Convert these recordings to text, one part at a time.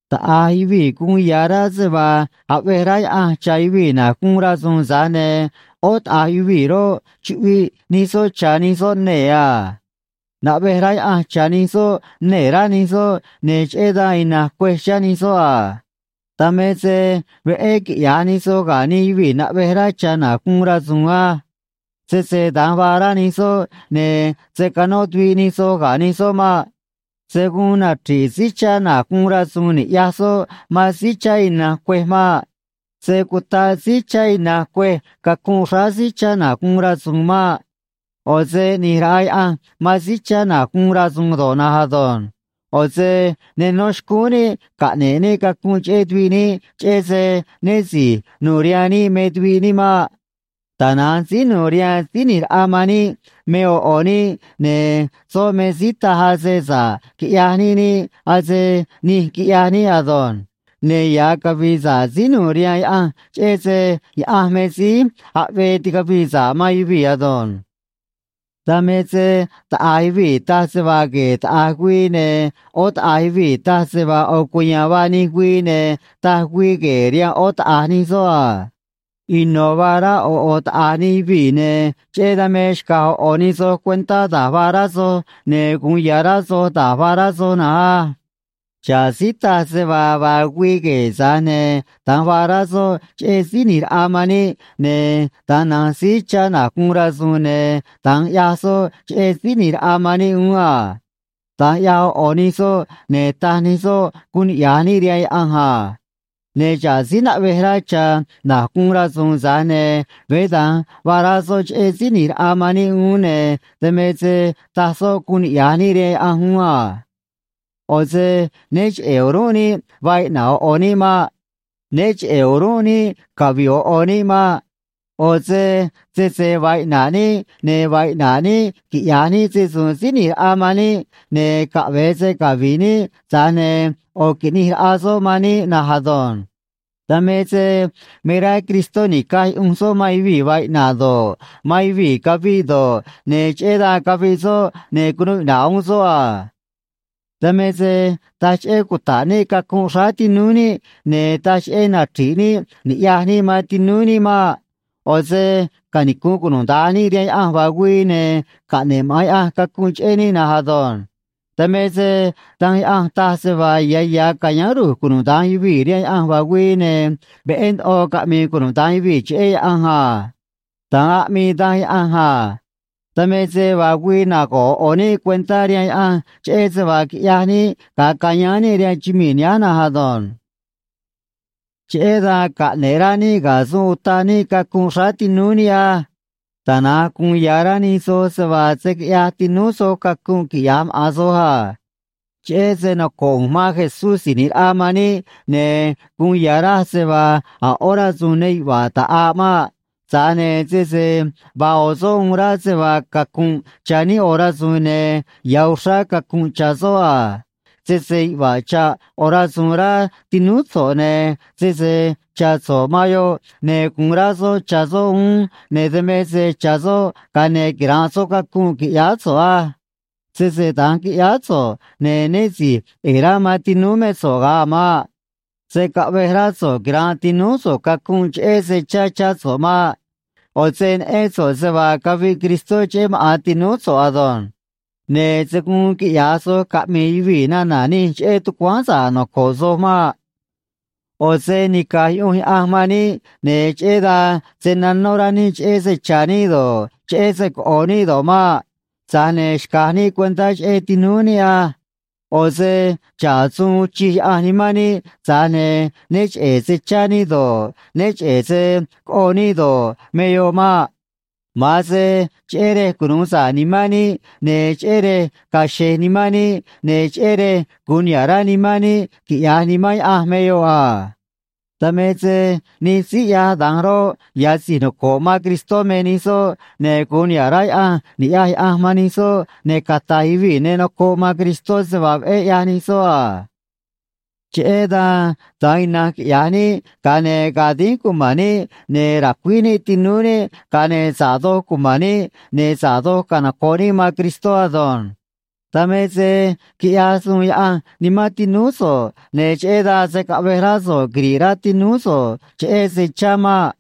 Taꞌa̱j yuvii̱ guun ya̱ rá se vaa aꞌvej rá Yaꞌanj cha̱ yuvii̱ na̱j guun rasu̱u̱n, tza̱j ne̱ ꞌó taꞌa̱j yuvii̱ roꞌ, chuꞌviꞌ nij soꞌ cha̱ nij soꞌ nee̱ a. Naꞌvej rá Yaꞌanj cha̱ nij soꞌ nee̱, rá nij soꞌ, ne̱ cheꞌé dan ina̱nj cuêj chá nij soꞌ a. Dan me se veꞌé quiꞌya̱j nij soj ga̱ nij yuvii̱ naꞌvej rá cha̱ na̱j guun rasu̱u̱n á. Sese da̱nj vaa rá nij soꞌ, ne̱ se̱ canó tuviꞌ nij soj ga̱ nij soꞌ maꞌ. Se̱ guun nachri̱ꞌ síí chá na̱j guun rasu̱u̱n ni̱ꞌyaj soꞌ man síí chá ina̱nj cuêj maꞌ. Se̱ cutaꞌ síí chá ina̱nj cuêj cacunꞌ xráá síí chá na̱j guun rasu̱u̱n maꞌ. ꞌO̱ se ꞌni̱j raꞌa Yaꞌanj man síí chá na̱j guun rasu̱u̱n do̱ꞌ na̱nj ado̱nj. ꞌO̱ se ne nó xcúún níꞌ caꞌne̱ꞌ níꞌ cacunꞌ cheꞌé tuviꞌ níꞌ cheꞌé se né si̱j nu̱u̱ rihaan níꞌ me tuviꞌ níꞌ maꞌ. Tana̱nj síí nu̱u̱ rihaan Síí ꞌNi̱j Raꞌa man níꞌ me ꞌo̱ ꞌo̱ níꞌ, ne̱ soꞌ me síí taj ase sa̱ꞌ quiꞌyaj níꞌ niꞌ, ase nij quiꞌyaj níꞌ ado̱nj. Ne̱ ya̱ cavi̱i̱ sa̱ꞌ síí nu̱u̱ rihaan Yaꞌanj cheꞌé se Yaꞌanj me síí aꞌvee ticavii sa̱ꞌ man yuvii̱ ado̱nj. Dan me se taꞌa̱j yuvii̱ taj se vaa gue̱e̱ taꞌa̱j güii, ne̱ ꞌó taꞌa̱j yuvii̱ taj se vaa ꞌo̱ cuya̱a̱n vaa nij güii, ne̱ taj güii gue̱e̱ rihaan ꞌó taꞌa̱j nij soꞌ a. Ino̱ vaa rá ꞌo̱ ꞌo̱ taꞌa̱j nij yuvii̱, ne̱ cheꞌé dan me xca̱j ꞌo̱ ꞌo̱ nij soj cuentá da̱j vaa rá soj, ne̱ gu̱un ya̱ rá soj da̱j vaa rá soj na̱nj á. Xa̱ꞌ síí taj se vaa vaa güii gue̱e̱, tza̱j ne̱ da̱nj vaa rá soꞌ cheꞌé Síí ꞌNi̱j Raꞌa man níꞌ, ne̱ da̱nj na̱nj síí chá na̱j guun rasu̱u̱n, ne̱ da̱nj ꞌyaj soꞌ cheꞌé Síí ꞌNi̱j Raꞌa man níꞌ uún a. Da̱nj ꞌyaj ꞌo̱ ꞌo̱ nij soꞌ, ne̱ taj nij soꞌ guun niꞌya̱j níꞌ rihaan Yaꞌanj a. Ne̱ xa̱ꞌ síí naꞌvej rá cha̱ na̱j guun rasu̱u̱n, tza̱j ne̱ veé da̱nj vaa rá soꞌ cheꞌé Síí ꞌNi̱j Raꞌa man níꞌ uún, ne̱ dan me se taj soꞌ guun niꞌya̱j níꞌ rihaan Yaꞌanj uún a. ꞌO̱ se né cheꞌe̱ o̱rúnꞌ níꞌ vaa iꞌna̱ꞌ ꞌo̱ ꞌo̱ níꞌ maꞌ. Né cheꞌe̱ o̱rúnꞌ níꞌ cavi̱ꞌ ꞌo̱ ꞌo̱ níꞌ maꞌ. ꞌO̱ se sese vaa iꞌna̱ꞌ níꞌ, ne̱ vaa iꞌna̱ꞌ níꞌ quiꞌya̱j níꞌ se‑su̱u̱n Síí ꞌNi̱j Raꞌa man níꞌ, ne̱ caꞌve̱e se cavi̱ꞌ níꞌ, tza̱j ne̱ ꞌo̱ qui̱ꞌnij raꞌa soꞌ man níꞌ na̱nj ado̱nj. Dan me se me rá Cristó ni̱caj yuꞌunj soꞌ man yuvii̱ vaa iꞌna̱ꞌ do̱ꞌ, man yuvii̱ caviꞌ do̱ꞌ, ne̱ cheꞌé dan caviꞌ soꞌ, ne̱ cunuu iꞌna̱ꞌ uún soꞌ a. Dan me se taj cheꞌé cuta̱ꞌ níꞌ cacunꞌ xráá tinúú níꞌ, ne̱ taj cheꞌé nachri̱ꞌ níꞌ ni̱ꞌyaj níꞌ man tinúú níꞌ maꞌ. ꞌO̱ se canicu̱nꞌ cunuda̱nj níꞌ rihaan Yaꞌanj vaa güii, ne̱ caꞌne̱ꞌ maꞌa̱n Yaꞌanj cacunꞌ cheꞌé níꞌ na̱nj ado̱nj. Dan me se Danj Yaꞌanj taj se vaa ya̱ ya̱ ca̱yáán ru̱j cunuda̱nj yuvii̱ rihaan Yaꞌanj vaa güii, ne̱ veꞌé ndoꞌo caꞌmi̱i̱ cunuda̱nj yuvii̱ cheꞌé Yaꞌanj a. Da̱nj aꞌmii Danj Yaꞌanj a. Dan me se vaa güii nago̱ꞌ ꞌo̱ ꞌo̱ níꞌ cuentá rihaan Yaꞌanj cheꞌé se vaa quiꞌyaj níꞌ ga̱a cayáán níꞌ rihaan chumii̱ nihánj na̱nj ado̱nj. Cheꞌé dan caꞌne̱ꞌ rá níꞌ ga̱ suun utaꞌ níꞌ cacunꞌ xráá tinúú níꞌ á. Tana̱nj gu̱un ya̱ rá nij soj se vaa se̱ quiꞌyaj tinúú soj cacunꞌ, quiꞌya̱j maꞌa̱n soj a. Cheꞌé se noco̱ꞌ ꞌu̱nj man Jesús Si̱j ꞌNi̱j Raꞌa man níꞌ, ne̱ guun ya̱ raj se vaa a̱ ꞌó rasu̱u̱n ne yuꞌva̱ꞌ ta̱ꞌaꞌ maꞌ. Tza̱j ne̱ sese vaa ꞌo̱ soꞌ uun rá se vaa cacu̱nꞌ cha̱ níꞌ ꞌo̱ rasu̱u̱n, ne̱ ya̱ uxrá cacu̱nꞌ cha̱ soꞌ a. Sese yuꞌva̱ꞌ cha̱ꞌ ꞌo̱ rasu̱u̱n rá tinúú so̱ꞌ, ne̱ sese cha̱ so̱ꞌ man yoꞌ, ne̱ gu̱un rá soꞌ cha̱ soꞌ uún, ne̱ dan me se cha̱ soꞌ, ga̱a ne̱ quira̱nꞌ soꞌ cacunꞌ, qui̱ꞌyáá so̱ꞌ á. Sese da̱nj qui̱ꞌyáá so̱ꞌ, ne̱ né si̱j ꞌe̱e̱ rá man tinúú mé so̱ꞌ ga̱a a̱ maꞌ. Se̱ caꞌvej rá so̱ꞌ quira̱nꞌ tinúú so̱ꞌ cacunꞌ cheꞌé se chá chá so̱ꞌ maꞌ. ꞌO̱ se neꞌén so̱ꞌ se vaa caviꞌ Cristó cheꞌé maꞌa̱n tinúú so̱ꞌ ado̱nj. Ne̱ se̱ guun quiꞌya̱j soj caꞌmi̱i̱ yuvii̱ nana̱ nij cheꞌé tucuáán sa̱ꞌ noco̱ꞌ soj maꞌ. ꞌO̱ se nica̱j yuꞌunj Yaꞌanj man níꞌ, ne̱ cheꞌé dan se̱ nanó rá níꞌ cheꞌé se cha̱ níꞌ do̱ꞌ, cheꞌé se coꞌo̱ níꞌ do̱ꞌ maꞌ. Tza̱j ne̱ xca̱j níꞌ cuentá cheꞌé tinúú níꞌ á. ꞌO̱ se xa̱ꞌ suun uun chij Yaꞌanj nimán níꞌ, tza̱j ne̱ né cheꞌe̱ se chá níꞌ do̱ꞌ, né cheꞌe̱ se coꞌo níꞌ do̱ꞌ, me yoꞌ maꞌ. Ma̱an se cheꞌé rej cunu̱u sa̱ꞌ nimán níꞌ ne̱ cheꞌé rej ga̱a̱ xe̱j nimán níꞌ ne̱ cheꞌé rej gu̱un niha̱ꞌ rá nimán níꞌ quiꞌya̱j Nimán Yaꞌanj me yoꞌ a. Dan me se nij síí ꞌyaj da̱nj roꞌ, ya̱ si̱j noco̱ꞌ man Cristó me nij soꞌ, ne̱ gu̱un niha̱ꞌ rá Yaꞌanj ni̱ꞌyaj Yaꞌanj man nij soꞌ, ne̱ cata̱j yuvii̱ ne nocoꞌ man Cristó se vaa veꞌé ꞌyaj nij soꞌ a. Cheꞌé dan da̱nj ina̱nj quiꞌya̱j níꞌ, ga̱a ne̱ ga̱a̱ dínj cuma̱n níꞌ, ne̱ ra̱cuíj níꞌ tinúú níꞌ, ga̱a ne̱ sa̱ꞌ doj cuma̱n níꞌ, ne̱ sa̱ꞌ doj canoco̱ꞌ níꞌ man Cristó ado̱nj. Dan me se quiꞌyaj suun Yaꞌanj nimán tinúú so̱ꞌ, ne̱ cheꞌé dan se̱ caꞌvej rá so̱ꞌ quiri̱ꞌ rá tinúú so̱ꞌ cheꞌé se chá maꞌ.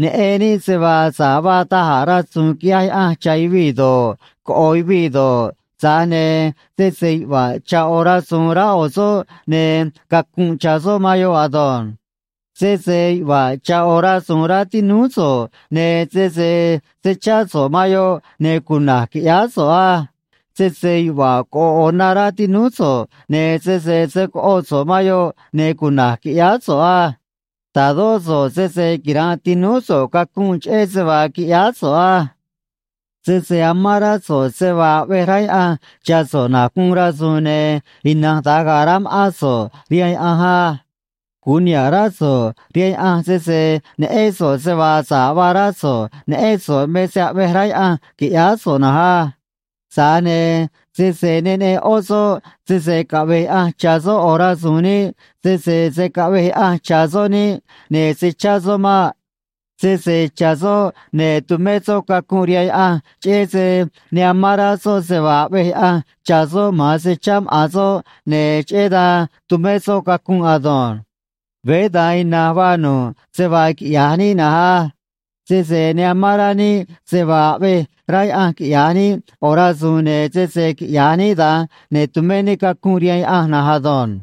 Neꞌen níꞌ se vaa sa̱ꞌ vaa da̱j a̱ rasu̱u̱n quiꞌyaj Yaꞌanj cha̱ yuvii̱ do̱ꞌ, coꞌo̱ yuvii̱ do̱ꞌ, tza̱j ne̱ sese yuꞌva̱ꞌ cha̱ꞌ ꞌo̱ rasu̱u̱n rá ꞌo̱ soꞌ, ne̱ cacu̱nꞌ cha̱ soꞌ man yoꞌ ado̱nj. Sese yuꞌva̱ꞌ cha̱ꞌ ꞌo̱ rasu̱u̱n rá tinúú so̱ꞌ, ne̱ sese se̱ chá so̱ꞌ man yoꞌ, ne̱ cuna̱j qui̱ꞌyáá so̱ꞌ á. Sese yuꞌva̱ꞌ coꞌo̱ꞌ ꞌo̱ na rá tinúú so̱ꞌ, ne̱ sese se̱ coꞌo so̱ꞌ man yoꞌ, ne̱ cuna̱j qui̱ꞌyáá so̱ꞌ á. Ta̱dó so̱ꞌ sese quira̱nꞌ tinúú so̱ꞌ cacunꞌ cheꞌé se vaa qui̱ꞌyáá so̱ꞌ á. Sese amán rá so̱ꞌ se vaa aꞌvej rá Yaꞌanj cha̱ so̱ꞌ na̱j guun rasu̱u̱n, ne̱ ina̱nj da̱nj ga̱a̱ rá ma̱ꞌán so̱ꞌ rihaan Yaꞌanj á. Gu̱un niha̱ꞌ rá so̱ꞌ rihaan Yaꞌanj sese neꞌén so̱ꞌ se vaa sa̱ꞌ vaa rá so̱ꞌ, neꞌén so̱ꞌ me se aꞌvej rá Yaꞌanj qui̱ꞌyáá so̱ꞌ na̱nj á. Tza̱j ne̱ sese ne neꞌen ꞌó soꞌ sese caꞌve̱j Yaꞌanj cha̱ soꞌ ꞌo̱ rasu̱u̱n niꞌ, sese se̱ caꞌvej Yaꞌanj cha̱ soꞌ niꞌ, ne̱ se̱ chá soꞌ maꞌ. Sese cha̱ soꞌ, ne̱ tumé soꞌ cacunꞌ rihaan Yaꞌanj cheꞌé se ne amán rá soꞌ se vaa aꞌvej Yaꞌanj cha̱ soꞌ, ma̱an se chá maꞌa̱n soꞌ, ne̱ cheꞌé dan tumé soꞌ cacunꞌ ado̱nj. Veé da̱nj ina̱nj vaa nu̱ꞌ se vaa quiꞌya̱j níꞌ nanj á. Sese ne amán rá níꞌ se vaa aꞌvej rá Yaꞌanj quiꞌya̱j níꞌ ꞌo̱ rasu̱u̱n, ne̱ sese quiꞌya̱j níꞌ da̱nj, ne̱ tu̱mé níꞌ cacunꞌ rihaan Yaꞌanj na̱nj ado̱nj.